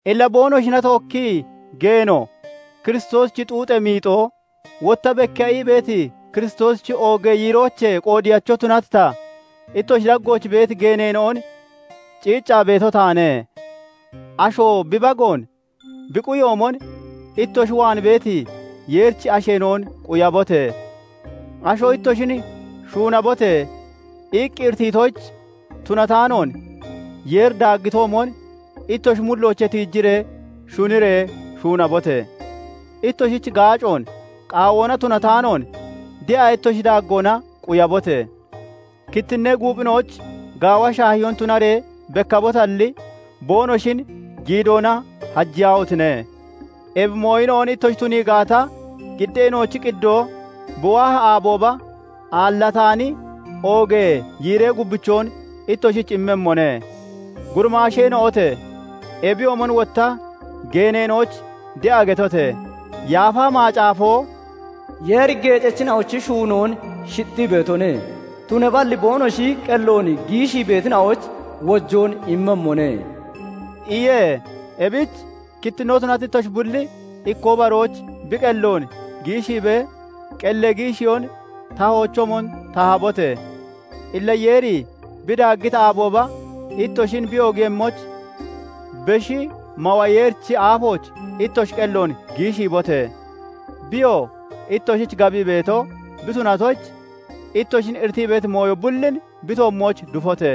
Illa boonoshina tookkii geeno, Kiristoosichi xuuxee miixoo, wotta bekkiya ii beeti Kiristoosichi oogee yiiroochee qoodiyacho tunati ta, ittoshi daggooch beeti geeneena'on ciiccaa beeto taane; asho bi bagoon bi quyoomon, ittoshi waan beeti Yeerichi asheena'on quyabote! Asho ittoshin "Shuunabote!" iqqi iritiitoyich tunataanoon, Yeeri daaggitoomon ittoshi mulloochee tiiji shuniree shuunabote! Ittoshich gaacoon qaawoona tunataanoon, de'a ittoshi daaggoona quyabote! Kittinnee guuphina'oyich gaawa shaahiyoon tunaree bekkabotalli, boonoshin giidoona hajiyaahotine! Ebi mooyina'on ittoshi tunii gaata, qiddeena'ochi qiddoo bi waahi aabooba, aallataani oogee yiiree gubbichoon ittoshich immemmone. Gurimaasheena'ote! Ebiyoomon wotta geeneena'oyich de'a getote! Yaafa Macaafo "Yeeri geecachina'ochi shuunoon shixxii beetone; tunaballi boonoshi qelloon giishii beetina'oyich wojoon immemmone" iye; ebich kittinnoo tunati ittoshi bulli ikkoo baroyich bi qelloon giishiibee qellee giishiyoon tahoochoomon tahabote! Illa Yeeri bi daaggiti aabooba ittoshin bi oogiiyemmoyich, Beshi Mawa Yeerichi aafooch ittoshi qelloon giishiibote! Biyoo ittoshich gabii beeto bi tunatoyich, ittoshin iritii beeti mooyo bullin bi toommooch dufote!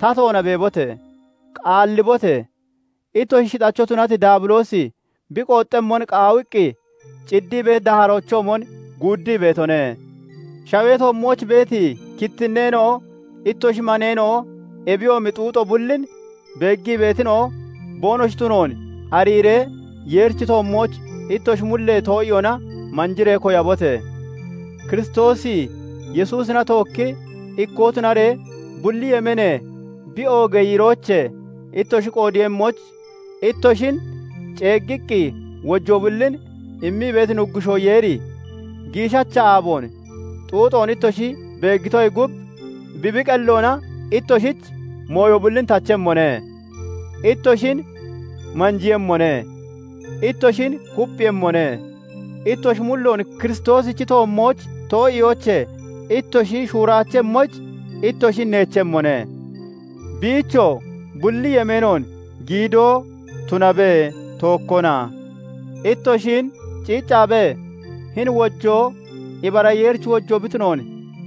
Tatoona beebote! Qaallibote! Ittoshi shixacho tunati Daabiloosi bi qooxxemmon qaawiqqi, ciddii beeti daaharoochoomon guuddii beetone; shawee toommooch beeti kittinnee ittoshi maneena'o ebiyoomi xuuxo bullin beeggii beetina'o boonoshi tunoon ariiree, Yeerichi toommooch ittoshi mullee too'iyoona manjiree koyabote! Kiristoosi Yesuusina tookki ikkoo tunaree, bulli yemeenee bi oogee yiiroochee ittoshi qoodeeyemmoyich ittoshin ceeggiqqi wojoo bullin immii beeti Nuggushoo Yeeri, giishacha aaboon xuuxoon ittoshi beeggitoyee gub, bi bi qelloona ittoshich mooyo bullin tachemmone; ittoshin manjiiyemmone; ittoshin kupphiiyemmone; ittoshi mulloon Kiristoosichi toommooch too'iyoochee ittoshi shuuraachemmoyich ittoshin neechemmone. Biichoo bulli yemeenoon giidoo tunabe! Tookkona. Ittoshin ciiccaabee, hini wojoo ibara Yeerichi wojoo bi tunoon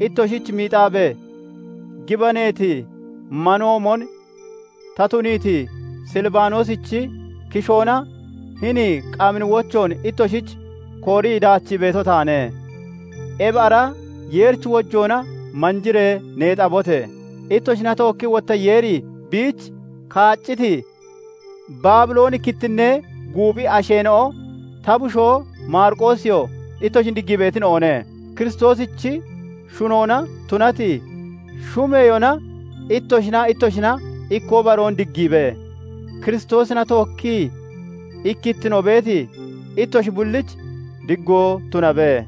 ittoshich miixaabee, gibaneeti manoomon ta tuniiti Silibanoosichi kishoona hini qamini wochoon ittoshich koorii daachii beeto taane. Ebi ara Yeerichi wojoona manjiree neexabote! Ittoshina tookkii wotta Yeeri biich kaacciti, Baabilooni kittinnee guuphi asheena'o, ta bushoo Maariqoosiyoo ittoshin diggii beetina'one. Kiristoosichi shunoona tunati shumeyoona ittoshinaa ittoshina ikkoo baroon diggiibe! Kiristoosina tookkii ikkittino beeti ittoshi bullich diggoo tunabe.